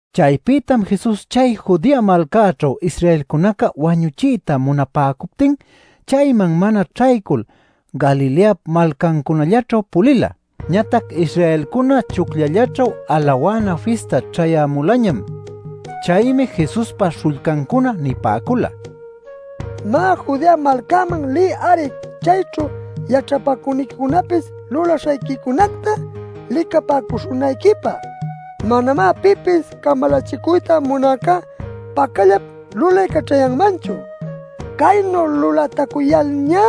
Chaypïtam Jesus chay Judea malcäćhu Israelcunaca wañuchiyta munapäcuptin, chayman mana ćhaycul Galileap malcancunallaćhu pulila. Ñatac Israelcuna Chucllallaćhu Alawana Fista ćhayämulañam. Chaymi Jesuspa śhullcancuna nipäcula: “Má, Judea malcäman liy-ari chayćhu yaćhapacüniquicunapis lulaśhayquicunacta licapäcuśhunayquipä. Manamá pipis camalachicuyta munäcá pacallap lulaycaćhayanmanchu. Caynu lulätucuyalñá,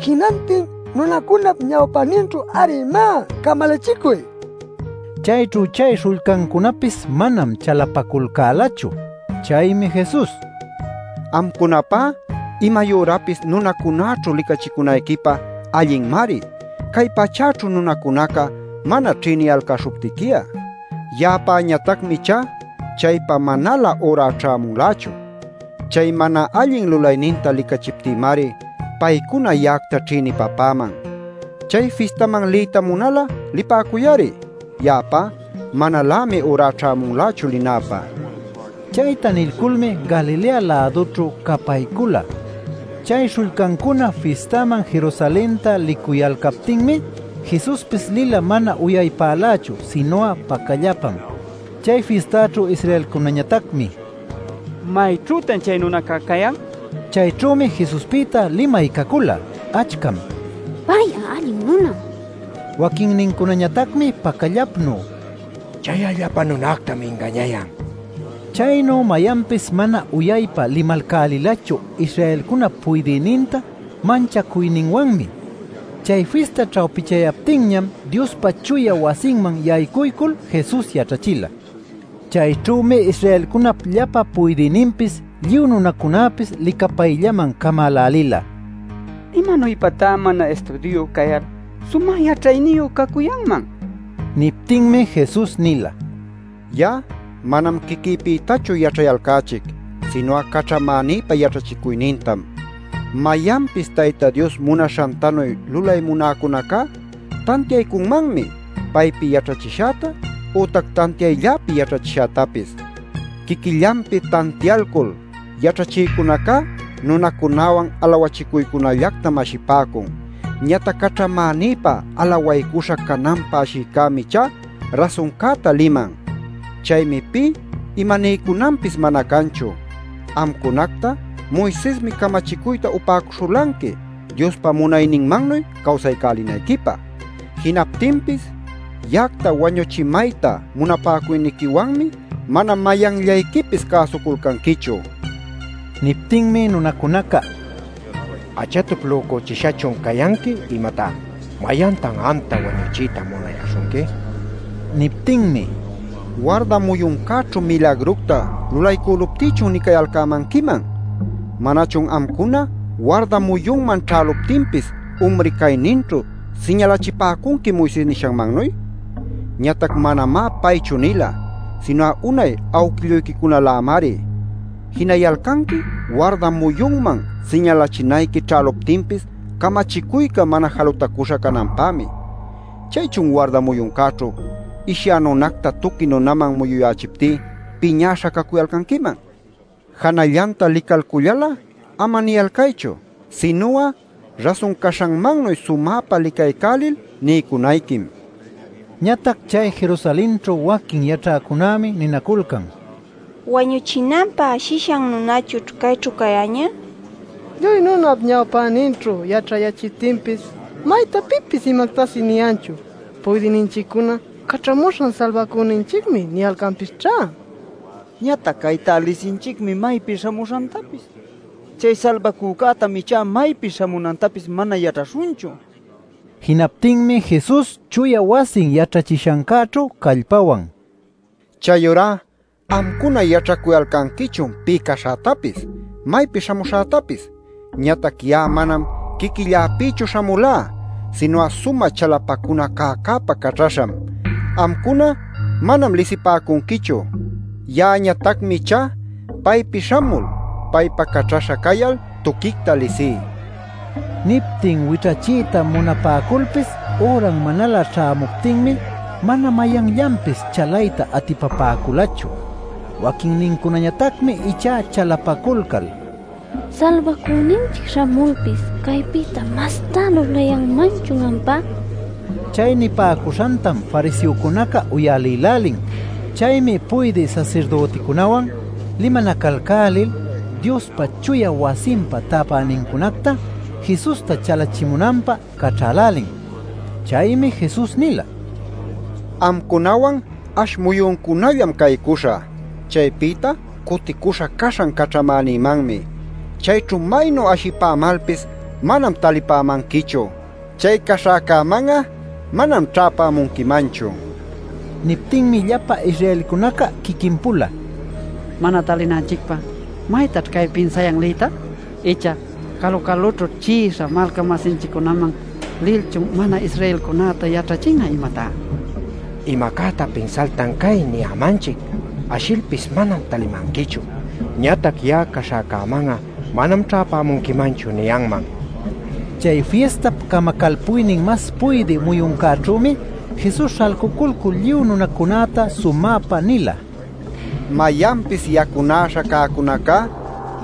jinantin nunacunap ñawpäninćhu-ari, má, camalachicuy” nin. Chayćhu chay śhullcancunapis manam chalapaculcälachu. Chaymi Jesus: “Amcunapá imayürapis nunacunaćhu licachicunayquipä allinmari cay pachäćhu nunacunaca mana ćhïniyalcäśhuptiqui'a; ya'apäñatacmi ichá chaypä manalä üra ćhämunlächu. Chay mana allin lulayninta licachiptïmari paycuna ya'acta ćhïnipapäman. Chay fistaman liyta munal'a lipäcuy-ari. Ya'apá manalämi üra ćhämunlächu linäpä” nin. Chayta nilculmi Galilea-lädućhu capaycula. Chay śhullcancuna fistaman Jerusalenta licuyalcaptinmi, Jesuspis lila mana uyaypälächu, sinu'a pacallapam. Chay fistaćhu Israelcunäñatacmi “¿Mayćhütan chay nunaca cayan?” nil ashipäcula. Chayćhümi Jesuspïta limay cacula. Achcam: “Pay'a allin nunam” nipäcula. Waquinnincunañatacmi pacallapnu: “Chay'a llapa nunactam ingañayan” nil ninaculcäla. Chaynu mayanpis mana uyaypa limalcälilachu Israelcunap puydïninta manchacuyninwanmi. Chay fista ćhawpichayaptinñam Diospa chuya wasinman yaycuycul Jesus yaćhachila. Chayćhümi Israelcunap llapa puydïninpis lluy nunacunäpis licapayllaman camälälila “¿Imanuypatá mana istudiuyu cayal sumä yaćhayniyu cacuyanman?” nil. Niptinmi Jesus nila: “Ya'a manam quiquïpïtachu yaćhayalcächic, sinu'a caćhamänïpa yaćhachicuynintam. Mayanpis Tayta Dios munaśhantanuy lulay munäcunacá tantiaycunmanmi paypi yaćhachishäta, ütac tantiaylläpi yaćhachishätapis. Quiquillanpi tantialcul yaćhachïcunacá nunacunäwan alawachicuycunallactam ashipäcun. Ñatac caćhamänïpa alawaycuśha cananpä ashïcämi ichá rasuncäta liman. Chaymi pï imaniycunanpis mana canchu. Amcunacta Moisesmi camachicuyta upäcuśhulanqui Diospa munayninmannuy cawsaycälinayquipä. Jinaptinpis ya'acta wañuchimayta munapäcuyniquiwanmi mana mayanllayquipis cäsuculcanquichu” nin. Niptinmi nunacunaca: “¿Achatup lücuchishachun cayanqui imatá? ¿Mayantan amta wañuchiyta munayäśhunqui?” nipäcula. Niptinmi: “Warda muyuncäćhu milagructa lulaycüluptïchun nicayalcämanquiman. ¿Manachun amcuna warda muyunman ćhäluptinpis umri cayninćhu siñalachipäcunqui Moises nishanmannuy? (Ñatac manamá paychu nila, sinu'a unay awquilluyquicunalämari.) Jinayalcanqui warda muyunman siñalachinayqui ćhäluptinpis camachicuyca mana jalutacüśha cananpämi. ¿Chaychun warda muyuncäćhu ishyä nunacta tuqui nunaman muyuyächiptí piñäśha cacuyalcanquiman? Janallanta licalcullal'a ama niyalcaychu. Sinu'a rasun caśhanmannuy sumäpa licaycälil niycunayquim” nin. Ñatac chay Jerusalenćhu waquin yaćhäcunämi ninaculcan: “¿Wañuchinanpä ashishan nunachućh cayćhu cayäñä? ¡Lluy nunap ñawpäninćhu yaćhayächiptinpis, maytá pipis imactapis niyanchu! ¿Puydïninchiccuna ‘Caćhamuśhan Salbacüninchicmi’ niyalcanpisćhá? Ñatac caytá lisinchicmi maypi śhamuśhantapis. Chay Salbacücätam ichá maypi śhamunantapis mana yaćhaśhunchu” nil. Jinaptinmi Jesus chuya wasin yaćhachishancäćhu callpawan: “Chayurá amcuna yaćhacuyalcanquichun pï caśhätapis, maypi śhamuśhätapis. Ñatac ya'a manam quiquilläpïchu śhamulá, sinu'a sumä chalapacuna cäcäpa caćhaśham. Amcuna manam lisipäcunquichu; ya'añatacmi ichá, paypi śhamul, paypa caćhaśha cayal tuquicta lisí” nin. Niptin wićhachiyta munapäculpis, üran manalä ćhämuptinmi mana mayanllanpis chalayta atipapäculachu. Waquinnincunañatacmi ichá chalapaculcal: “Salbacüninchic śhamulpis ¿caypïta mastá lulayanmanchun ampá?” nipäcula. Chay nipäcuśhantam fariseocunaca uyalïlälin. Chaymi puydï sasirdüticunäwan limanacalcälil Diospa chuya wasinpa täpänincunacta Jesusta chalachimunanpä caćhälälin. Chaymi Jesus nila: “Amcunawan ash muyuncunallam caycuśhä. Chaypïta cuticuśhä caśhan caćhamänïmanmi. Chayćhu maynu ashipämalpis manam talipämanquichu. Chay caśhäcäman'a manam ćhäpämunquimanchu” nin. Niptinmi llapa Israelcunaca quiquin-pula: “Mana talinanchicpä ¿maytaćh cay pinsayan liyta? ¿Icha calu-calućhu chi'isha malca-masinchiccunaman lilchun mana-Israelcunäta yaćhachin'a, imatá? Imacäta pinsaltan cay niyämanchic: ‘Ashilpis manam talimanquichu’ ñatac ‘Ya'a caśhäcäman'a manam ćhäpämunquimanchu’ niyanman” nil nipäcun. Chay fistap camacalpuynin mas puydï muyuncäćhümi Jesus śhalculcul lluy nunacunäta sumäpa nila: “Mayanpis yacunäśha cäcunacá,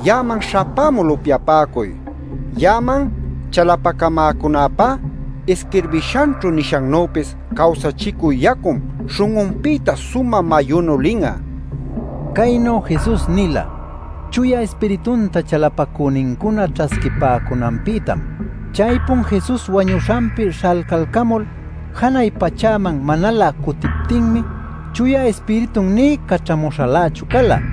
ya'aman śhapämul upyapäcuy. Ya'aman chalapacamäcunäpá, isquirbishanćhu nishannüpis cawsachicü yacum śhun'unpïta sumä mayunu lin'a” nil. Caynu Jesus nila Chuya Ispiritunta chalapacünincuna ćhasquipäcunanpïtam. Chaypun Jesus wañuśhanpi śhalcalcamul janay pachäman manalä cutiptinmi Chuya Ispiritun nï caćhamuśhalächu cala.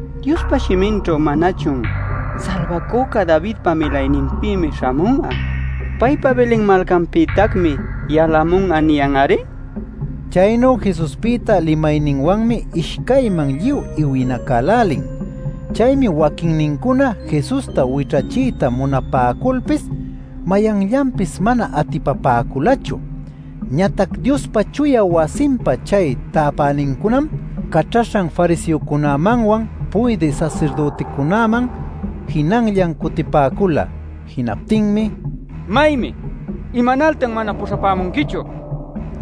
Diospa shiminćhu ¿manachun: ‘Salbacüca Davidpa milayninpïmi śhamun'a; paypa Belen malcanpïtacmi yalamun'a’ niyan-ari?” nipäcula. Chaynu Jesuspïta limayninwanmi ishcayman lluy iwinacälälin. Chaymi waquinnincuna Jesusta wićhachiyta munapäculpis mayanllanpis mana atipapäculachu. Ñatac Diospa chuya wasinpa chay täpänincunam caćhaśhan fariseocunämanwan puydï sasirdüticunaman jinanllan cutipäcula. Jinaptinmi: “¿Maymi? ¿Imanaltan mana puśhapämunquichu?” nicuyalcan.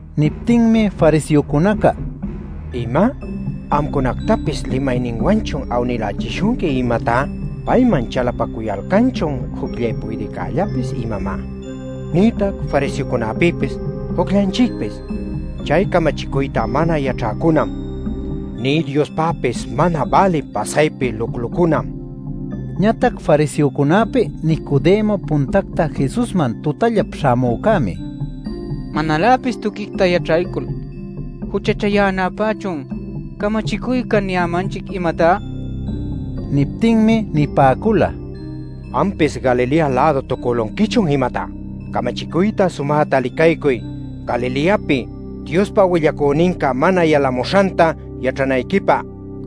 Niptinmi fariseocunaca: “¿Ima? ¿Amcunactapis limayninwanchun awnïlächishunqui, imatá? ¿Payman chalapacuyalcanchun jucllay puydïcällapis imamá, nïtac fariseocunäpïpis jucllanchicpis? ¡Chay camachicuyta mana yaćhäcunam, nï Diospäpis mana bälï pasaypi luclucunam!” nipäcun. Ñatac fariseocunäpi Nicodemo puntacta Jesusman tutallap śhamücämi: “¿Manaläpis tuquicta yaćhaycul juchachayänapächun camachicuyca niyämanchic, imatá?” nin. Niptinmi nipäcula: “¿Ampis Galilea-lädu-tucülunquichun, imatá? Camachicuyta sumäta licaycuy Galileapi Diospa willacüninca mana yalamuśhanta yaćhanayquipä” nil.